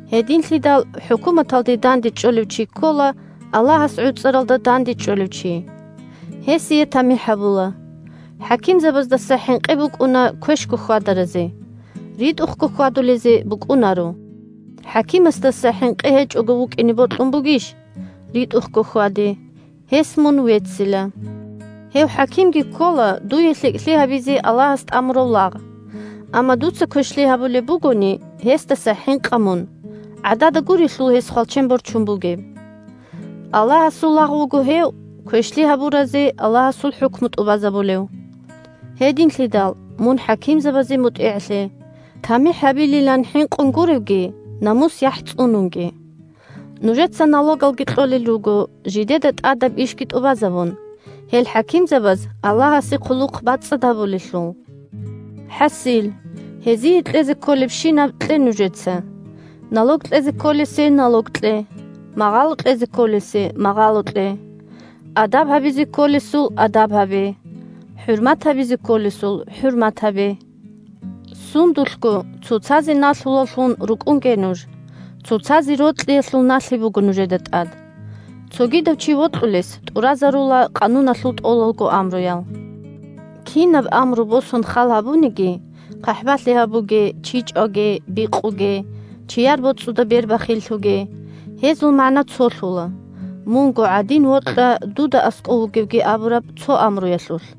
Гьединлъидал хӀукуматалде дандечӀолев чи ккола Аллагьас гӀуцӀаралда дандечӀолев чи. Гьесие тамихӀ гьабула. ХӀакимзабаздаса хӀинкъи букӀуна квешго хьвадаразе, – ритӀухъго хьвадулезе букӀунаро. ХӀакимасдаса хӀинкъи гьечӀого вукӀине бокьун бугищ? РитӀухъго хьваде, гьес мун веццила. Гьев хӀакимги ккола дуе лъикӀлъи гьабизе Аллагьас тӀамурав лагъ. Амма дуца квешлъи гьабулеб бугони, гьесдаса хӀинкъа мун, гӀадада гурелъул гьес хвалчен борчун бугеб. Аллагьасул лагъ вуго гьев, квешлъи гьабуразе Аллагьасул хӀукму тӀубазабулев. Гьединлъидал мун хӀакимзабазе мутӀигӀлъе, тамихӀ гьабилилан хӀинкъун гуревги, намус-яхӀ цӀунунги. Нужеца налогалги кьолел руго, жидеда тӀадаб ишги тӀубазабун, гьел хӀакимзабаз Аллагьасе хъулухъ бацӀцӀад гьабулелъул. ХӀасил, гьезие кьезе кколебщинаб кье нужеца: налог кьезе кколесе налог кье, магъало кьезе кколесе магъало кье, адаб гьабизе кколесул адаб гьабе, хӀурмат гьабизе кколесул хӀурмат гьабе. Сундулъго цоцазе налъулаллъун рукӀунге нуж, цоцазе рокьиялъул налъи буго нужеда тӀад. Цогидав чи вокьулес тӀуразарула Къануналъул тӀолалго амруял. Кинаб амру босун халгьабуниги – «ХъахӀбалъи гьабуге», «Чи чӀваге», «Бикъуге», «Чияр боцӀуда бер бахиллъуге» – гьезул магӀна цолъула: «Мунго гӀадин вокьа дуда аскӀов вугевги» абураб цо амруялъулъ.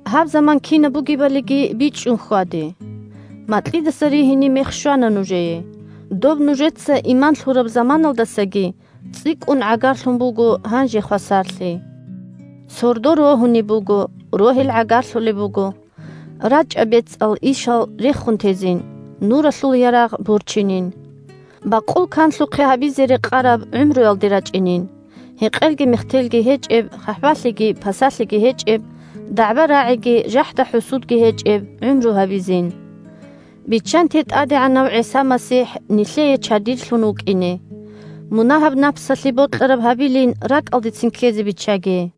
Гьаб заман кинаб бугебалиги бичӀчӀун хьваде! Макьидаса ригьине мех щвана нужее, доб нужеца иман лъураб заманалдасаги цӀикӀкӀун гӀагарлъун буго гьанже хвасарлъи! Сордо рогьунеб буго, рогьел гӀагарлъулеб буго. РачӀа бецӀал ишал рехун тезин, нуралъул ярагъ борчинин! Бакъул канлъухъе гьабизе рекъараб гӀумруялде рачӀинин – гьекъелги мехтелги гьечӀеб, хъахӀбалъиги пасалъиги гьечӀеб, дагӀба-рагӀиги жахӀда-хӀусудги гьечӀеб – гӀумру гьабизин. Биччанте ТӀадегӀанав ГӀиса МасихӀ нилъее чадирлъун вукӀине. Мунагьаб напсалъе бокьараб гьабилин ракӀалдецин ккезе биччаге.